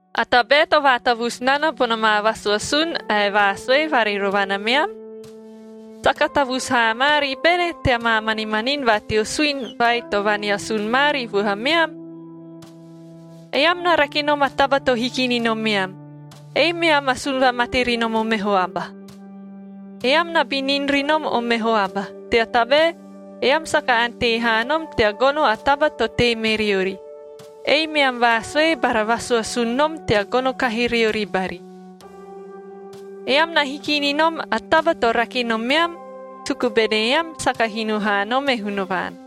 A tabae to vaatavusu nana bona maa vaasuasun ae vaasue varirovana meam? Saka tavusu haa maari bene tea maa manimanini va teo suini vai to vaneasun maari vuhameam? Eam na rake nom a taba to hiki ni nomeam, ei meam asun vamate ri nom o meho aba. Eam na binin ri nom o meho aba, tea tabae eam saka ante haa nom tea gono a taba to tei me riori, ei meam vaasue bara vasuasun nom tea gono kahi riori bari. Eam na hiki ni nom a taba to rake nomeam, suku bene eam saka hino haa nom e Hunavaan.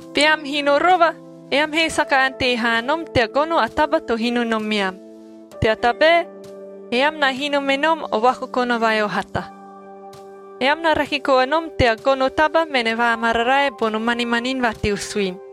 Beam hino rova, eam he saka ante haa nom tea gono a taba to hino nomeam, tea tabae eam na hino me nom o vakokona vai o hata. Eam na rake koa nom tea gono taba mene vaamararae bono manimanin va teo suini.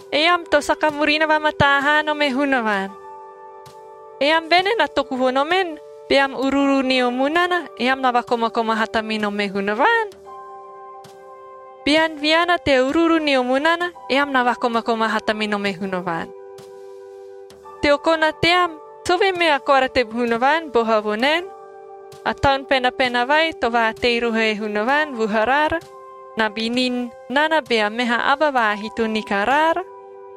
Eam to saka murina vamataa haa nom e Hunavaan!a Eam bene na toku vo nomen, beam uruuru nio munana, eam na vakomakoma hata me nom e Hunavaan? Bean viana tea uruuru nio munana, ean na vakomakoma hata me nom e Hunavaan. Teo kona team, sovee mea koara te Hunavaan boha vo naen, “A Taun Penapena vai to vaatei roho e Hunavaan vuharaara na binin nana bea meha aba vaahito ni karaara”?b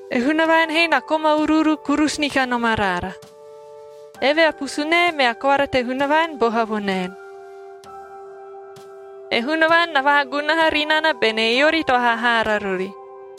E Hunavaan he na koma uruuru kurusu ni kanom araara. Eve a pusunae mea koara te Hunavaan boha vo naen, “E Hunavaan na vaagunaha ri nana bene eori to hahaara rori,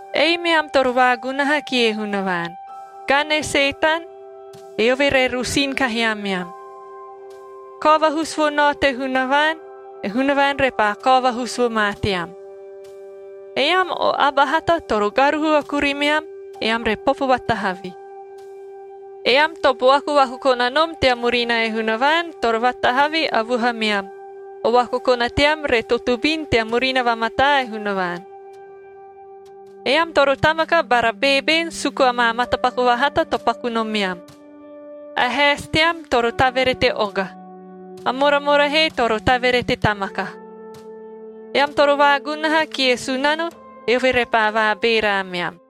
Ei meam toro vaagunaha kie Hunavaan. Gani e Setan, eove re rosin kahi ameam. Kao vahusu vo nao te Hunavaan, e Hunavaan repaa kao vahusu vo ma team. Eam o aba hata toro garuhu a kurimeam, eam re popo vatahavi. Eam to buaku vakokona nom tea murina e Hunavaan, toro vaatahavi a vuhameam, o vakokona team re totobin tea murina vamataa e Hunavaan. Eam toro tamaka bara beeben suku amaa matapaku vahata to paku nomeam. A haesi team toro taverete oga. A moramora he toro taverete tamaka. Eam toro vaagunaha kie Sunano, eove repaa vaabeera ameam.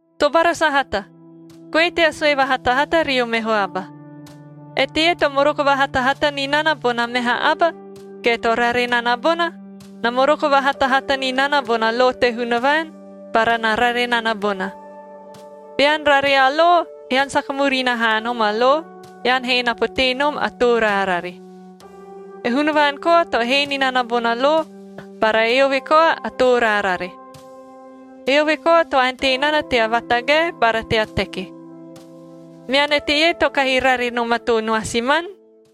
Tobara sahata, goe tea sue vahatahata rio meho aba. Eteie to moroko vahatahata ni nana bona meha aba ge to rare nana bona, na moroko vahatahata ni nana bona lo te Hunavaan bara na rare nana bona. Bean rare a lo, ean saka murina haa nom a lo, ean he na potee nom a too raarare. E Hunavaan koa to hee ni nana bona lo bara eove koa a too raarare. Eove koa to ante nana tea vaatagae bara tea teki. Mean eteie to kahi rare nom a too noasiman?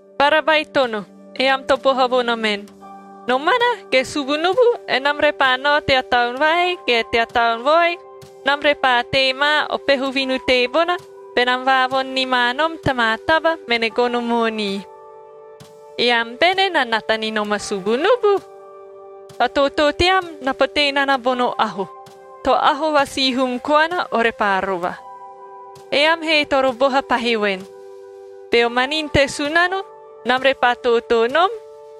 Bara baitono, eam to boha vo nomen, “Nomana ge subunubu enam repaa nao tea taon vai, ge tea taon vaoi, enam repaa tei ma o peho vinu teebona, benam vaavoni ni ma nom ta maa taba mene gono moonii.” Eam bene na nata ni nom a subunubu? A tootoo team na potee nana bono aho – to aho va sihum koana, ore paa rova. Eam he toro boha pahi voen, “Beo manini te Sunano, enam repaa tootoo nom,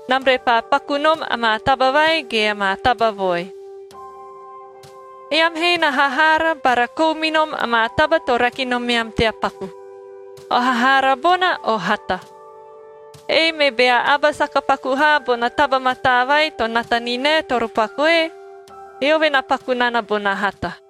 enam repaa paku nom amaa taba vai ge amaa taba vaoi.” Eam he na hahaara bara kou me nom amaa taba to rake nomeam tea paku. O hahaara bona o hata. Ei me bea aba saka paku haa bona taba mataa vai to nata ni nae, toro pakue, eove na paku nana bona hata.